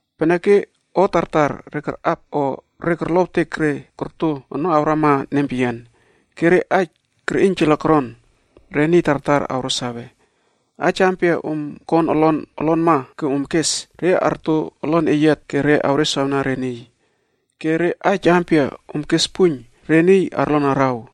Peneke o tartar re karꞌap o re korlowtek re korto ono awrama nempeyian. Ke re aij kerꞌiynjala koron, re niy tartar awro sawe. Aij ampia om kon olon olonma ke om kes, re arto olon eyiat ke re awreswawna re niy. Ke re aij ampia om kes puiyn, re niy arlon araw.”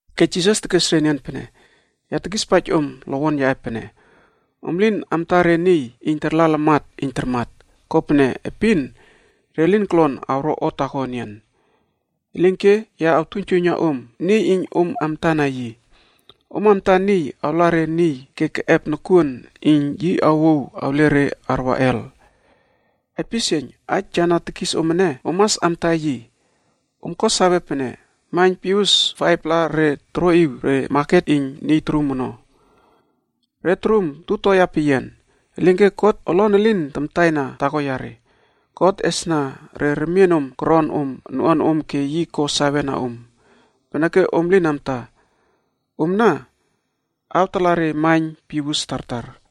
Ke yi tekes re enian pene, “Ya tekispaij om lowon yaꞌe pene, om lin amta re niy iyn tarla lamat iyn tarmat, kopene epin re lin kolon awro o taako enian. Elinke ya awtuiynjuiyna om niy iyn om amtana yi. Om mas amta niy awla re niy ke na keꞌep nokuon iyn yi awouw awle re arwa Hel. Aipisieiyn! Aij ya na tekis om ene, om mas amta yi. Om ko sawe pene maiyn Pius 5-pla re toroꞌiw re maket iyn niy torum ono, re torum 2-toea peyian.a Elinke God olon elin tamtaina taako yare. God esna re remienom koron om noꞌuanom ke yi ko sawena om. Peneke om lin amta, omna awtala re maiyn piwus tartar.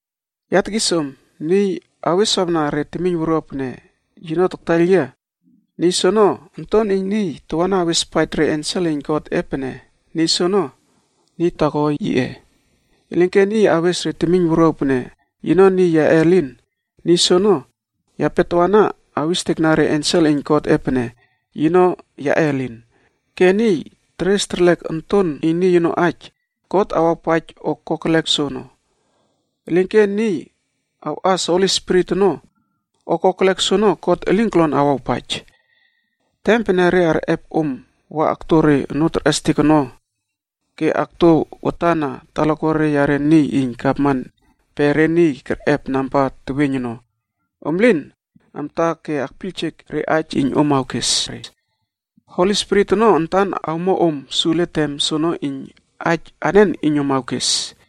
“Ya tekispaij om, niy aweswawna re temiyn wuruaw pene yino taktaiyl yia, niy soono Onton iyn Niy tawana awespaij re ensel iyn Godꞌe pene niy soono niy taako yiꞌe. Elinke niy awes re temiyn wuruaw pene yino niy yaꞌe elin, niy soono yape tawana awistekna re ensel iyn Godꞌe pene yino yaꞌe elin. Ke niy teres terlek Onton iyn Niy ono aij, God awawpaij o kokelek soono. Elinke niy awꞌas Holi Spirit ono, o kokelek soene God elin kolon awawpaij. “Tem pene re arꞌep om wa akto re onoo terꞌestek ono ke akto watan na talakuare yare niy iyn gavman pe re niy kerꞌep namba teweiyn ono, om lin amta ke akpiyljek re aij iyn om awkes re. Holi Spirit ono antan awmo om sule tem soono iyn aij anen iyn om awkes.”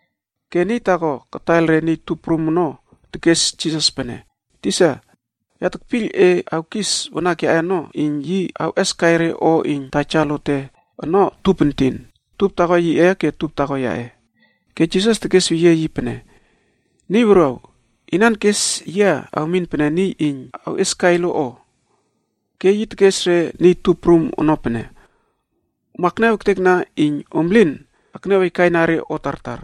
Ke niy taako kataiyl re niy tup prum ono tekes Jisas pene, “Tisa, ya tekpiyl e awkis wanak yaꞌe ono iyn yi awꞌeskai re o iyn taja lote ono tup entin. Tup taako yiꞌe ke tup taako yaꞌe.” Ke Jisas tekes weyie yi pene, “Niy wuruaw! Inan kes yia awmin pene niy iyn awꞌieskai lo o?” Ke yi tekes re niy tup prum ono pene, “Om akniaw ektekna iyn om lin akniaw aikaina re o tartar.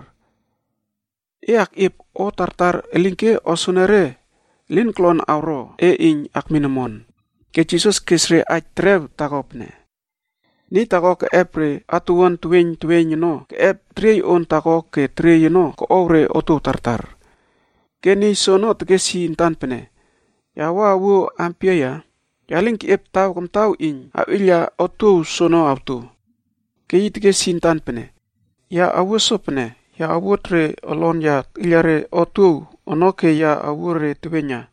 E koluon akꞌiep o tartar, elinke o soenere awro erlek e ke elin kolon awro e iyn akmin omon pene peyian ono.” Ke Jisas kes re aij terew taako pene, “Niy taako keꞌep re atuwuan teweiyn teweiyn ono keꞌep teriey on taako ke teriey ono koꞌow re otuow tartar. Ke niy soono tekes yi antan pene, ‘Ya wua awuo ampia ya? Ya lin keꞌiep taw kamtaw iyn awꞌiyla otuow soono awto.’ “Ke yi tekes yi antan pene, ‘Ya awuo sopene, ya awuot re olon ya tekꞌiyla re wit ono ke ya awuo re teweiyna.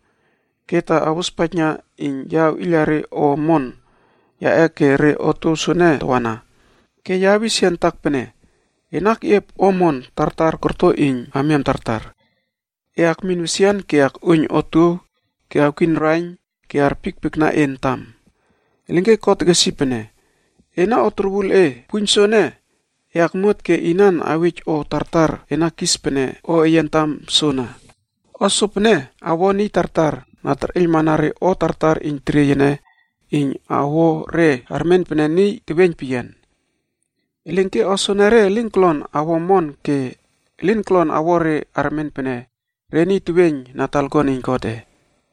Ke ta awrospaijna iyn ya awꞌiyla re o omon yaꞌe ke re wit soene tawana. Ke ya awis yia antak pene, “Ena keꞌiep o omon tartar korto iyn amiam tartar. E akmin wesian ke akꞌuoiyn otuow ke awkiyn raiyn ke arpiekpiekna e antam.” ’ “Elinke God tekes yi pene, ‘Ena o torwul e! Puiyn soene e akmuat ke inan awej o tartar e na kis pene o eye antam soono?’ “O sopene awo niy tartar na terꞌeiylmana re o tartar iyn teriey ene iyn awo re armen pene re niy teweiyn peyian. Elinke o soene re elin kolon awo omon ke elin kolon awo re armen pene re niy teweiyn na talakuan iyn Godꞌe.”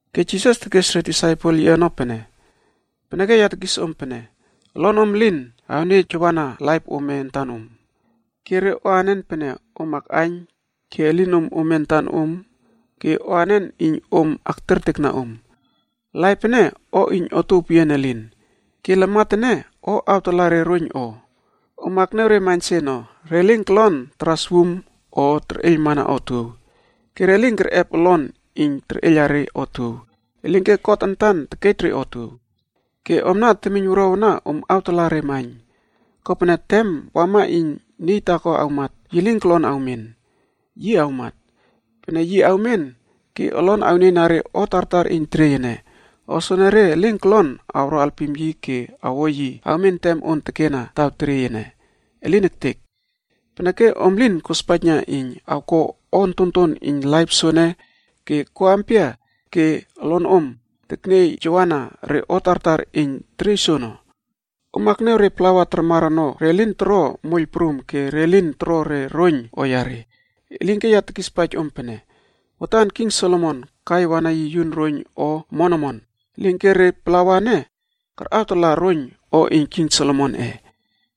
Ke Jisas tekes re disaipel yiꞌe ono pene, “Peneke ya tekis om pene, olonom elin akniejawana laip ome antan om. Ke re o anen pene om akꞌaiyn ke elinom ome antan om ke o anen iyn om aktertekna om. Laip ene o iyn otuow peyian elin, ke lamat ene o awtala re roiyn o. Om akniaw re maiyn se ono, re lin kolon taras wum o terꞌeiylmana otuow. Ke re lin kerꞌep olon iyn terꞌeiyla re otuow, elinke God antan tekej re otuow. Ke omna temiyn wuruaw ana, om awtalaꞌa re maiyn. Kopene, tem wama iyn niy taako awmat, yi lin kolon awmen. Yi awmat. Pene yi awmen ke olon awnieyna re o tartar iyn teriey ene, o soenere lin kolon awro alpim yi ke awo yi awmen tem on tekena taw teriey ene. Elin ektek! Peneke om lin kospaijna iyn awko o ontonton iyn laip soene ke ko ampia ke olonom tekniejawana re o tartar iyn teriey soono? “Om akniaw re plawa tarmar ono re lin toro moiyl prum ke re lin toro re roiyn o yare. Elinke ya tekispaij om pene, watan king Solomon kai wana yun roiyn o omon omon, elinke re plawa ene karꞌawtala roiyn o iyn king Solomonꞌe.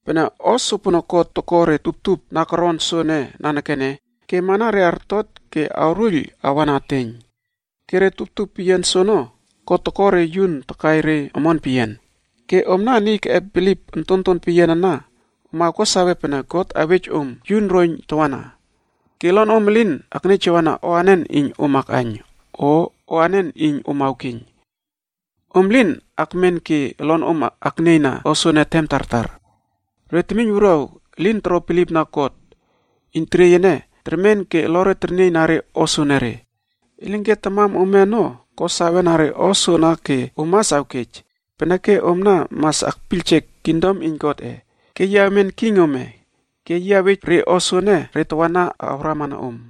Pene o sopono God toko re tuptup na koron soene nanekene ke amana re artot ke awruiyl awa na eteiyn. Ke re tuptup peyian soono God toko re yun takai re omon peyian. Ke omna niy keꞌep bilip ontonton peyian ana om awko sawe pene God awej om yun roiyn tawana. Ke olonom elin akniejawana o anen iyn om akꞌaiyn, o o anen iyn om awkeiyn. Om lin akmen ke olonom aknieyna o soene tem tartar. Re temiyn wuruaw elin toro bilipna God, iyn teriey ene termen ke olore ternieyna re o soene, elinke tamam ome ono ko sawena re o soana ke om mas awkej. Peneke omna mas akpiyljek kingdom iyn Godꞌe. Ke yi awmen king ome, ke yi awej re o soene re tawana awramana om.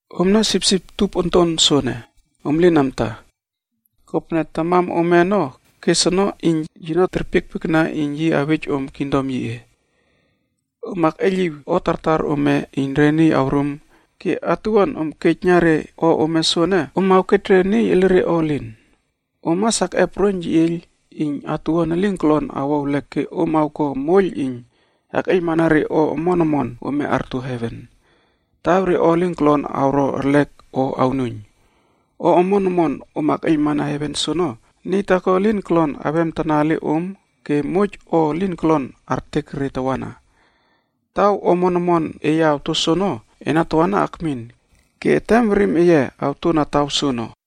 “Omna sipsip tup onton soene, om lin amta, kopene tamam ome ono kes ono iyn yino terpiekpiekna iyn yi awej om kingdom yiꞌe. Om akꞌeiyliw o tartar ome iyn re niy awrum ke atuwuan om awkej na re o ome soene, om awkej re niy elire o elin. Om mas akꞌep roiyn yeꞌieiyl iyn atuwuan elin kolon awo ewlek ke om awko moiyl iyn akꞌeiylmana re o omon omon ome arto heven, taw re o elin kolon awro erlek o awnuiyn. O omon omon om akꞌeiylmana heven soono, niy taako elin kolon awemtana ele om ke moij o elin kolon artek re tawana. Taw o omon omon eye awto soono, ena tawana akmin ke etem werim eye awtona taw soono.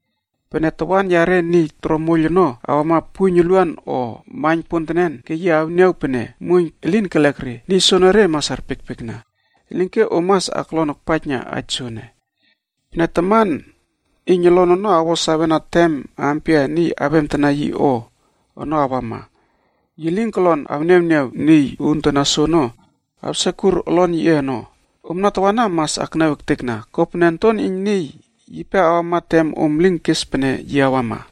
Pene tawan yare niy toro moiyl ono awama puiyn uluan o maiyn pontenen ke yi awniaw pene muoiyn elin kelek re, niy soonore mas arpiekpiekna. “Elinke om mas aklon akpaijna aij soene: Pene taman iyn olon awo sawena tem ampia niy awemtana yi o ono awama, yi lin kolon awniawniaw niy uuntana soono awsekur olon yiꞌe ono. Omna tawana mas akniaw ektekna, kopene Onton iyn Niy yipe awama tem om lin kes pene yi awama.”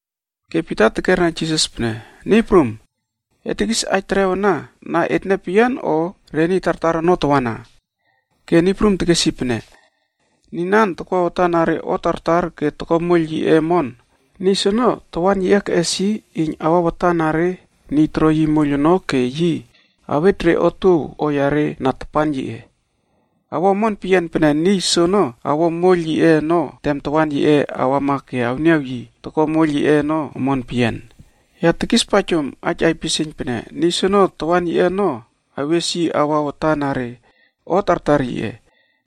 Ke Pita tekera Jisas pene, “Niy Prum, e tekis aij terew ana na etne peyian o re niy tartar ono tawana?” Ke Niy Prum tekesweyie yi pene, “Niy ampia toko bilipna Krais ke na takwa watan na re o tartar ke takmat ektekna moiyl yiꞌe ono, Niy soono tawan yiꞌe keꞌes yi iyn awa watan na re niy toro yi moiyl ono ke yi awej re otuow o yare na tapan yiꞌe. Awo omon peyian pene niy soono awo moiyl yiꞌe ono tem tawan yiꞌe awama ke awniaw yi toko moiyl yiꞌe ono omon peyian. Ya tekispaij om aij aipisieiyn pene niy soono tawan yiꞌe ono awes yi awa watan na re o tartar yiꞌe.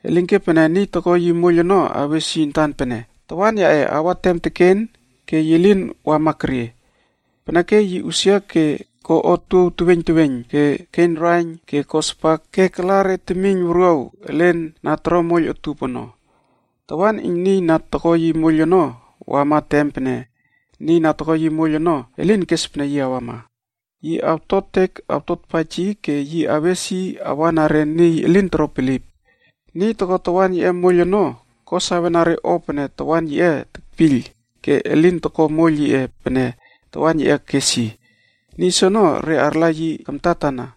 Elinke pene niy toko yi moiyl ono awes yi antan pene, ‘Tawan yaꞌe awa tem teken ke yi lin awama kerie,’ peneke yi usia ke ko otuow teweiyn teweiyn ke keiyn raiyn ke ko spak ke takla re temiyn wuruaw elen re na toro moiyl utup ono. Tawan iyn niy na toko yi moiyl ono awama tem pene niy na toko yi moiyl ono elin kes pene yi awama. Yi awtotek awtotpaij yi ke yi awes yi awa na re niy elin toro bilip. “Niy toko tawan yiꞌe moiyl ono ko sawena re o pene tawan yiꞌe tekpiyl ke elin toko moiyl yiꞌe pene tawan yiꞌe kes yi, niy soono re arla yi kamtatana.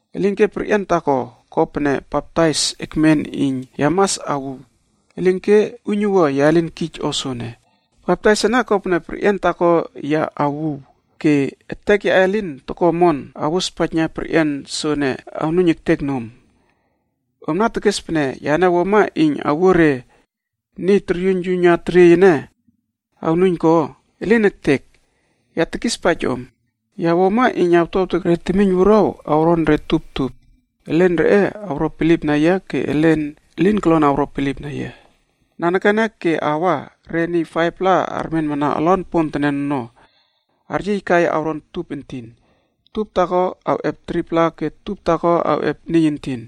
Elinke perꞌian taako ko pene baptais ekmen iyn ya mas awuw,d elinke uiynuwua ya lin kij o soene. Baptais ene kopene perꞌian taako ya awuw. Ke etek yaꞌe lin toko omon awospaijna perꞌian soene awnuiyn ektek nom. Omna tekes pene yane wuama iyn awuo re niy toryuiynyuiyna teriey ene awron omon ko? Elin ektek! Ya tekispaij om, ya wuama iyn awtuawtek re temiyn wuruaw awron re tup tup. Elen reꞌe awro bilipna yia ke elen elin kolon awro bilipna yia. Nanekene ke awa re niy 5-pla armenmana olon ponpontenen ono aryiykai awron tup entin. Tup taako awꞌep 3-pla ke tup taako awꞌep niy entin.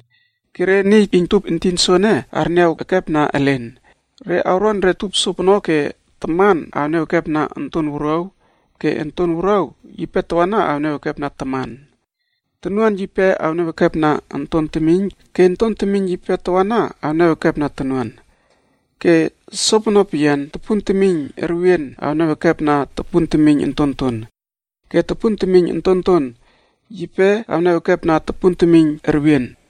Ke re niy iyn tup entin soene arniaw ekepna elen. Re awron re tup sopono ke taman awniaw ekepna onton wuruaw ke onton wuruaw yipe tawana awniaw ekepna taman. Tonuan yipe awniaw ekepna onton temiyn ke onton temiyn yipe tawana awniaw ekepna tonuan, ke sopono peyian topun temiyn erwien awniaw ekepna tupun temiyn ontonton, ke topun temiyn ontonton yipe awniaw ekepna tupun temiyn erwien.”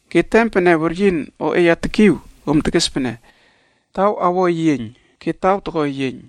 Ke tem pene weryin oꞌeya tekiw, om tekes pene, ‘Taw awo eyieiyn,’ ke taw toko eyieiyn.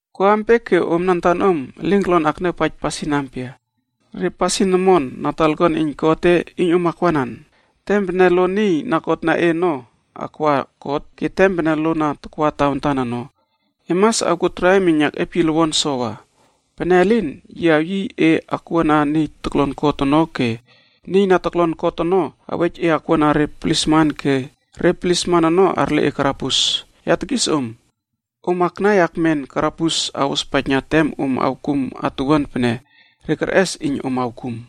“Ko ampia ke omna antanom elin kolon akniawpaij pasin ampia, re pasin omon na talakuan iyn Godꞌe iyn om akwanan? Tem pene lo niy na kotna e ono akwa kot, ke tem pene lo na takwa tawantan ono, e mas awkuo traim iyn akꞌiep yi lowon enian sowa. Pene elin, yi awyiy e akwuana niy toklon kot ono ke niy na toklon kot ono awej e akwuana re plisman ke re plisman ono arle e karabus. Ya tekis om, om aknai akmen karabus awospaijna tem om awkum atuwuan pene re kerꞌes iyn om awkum.”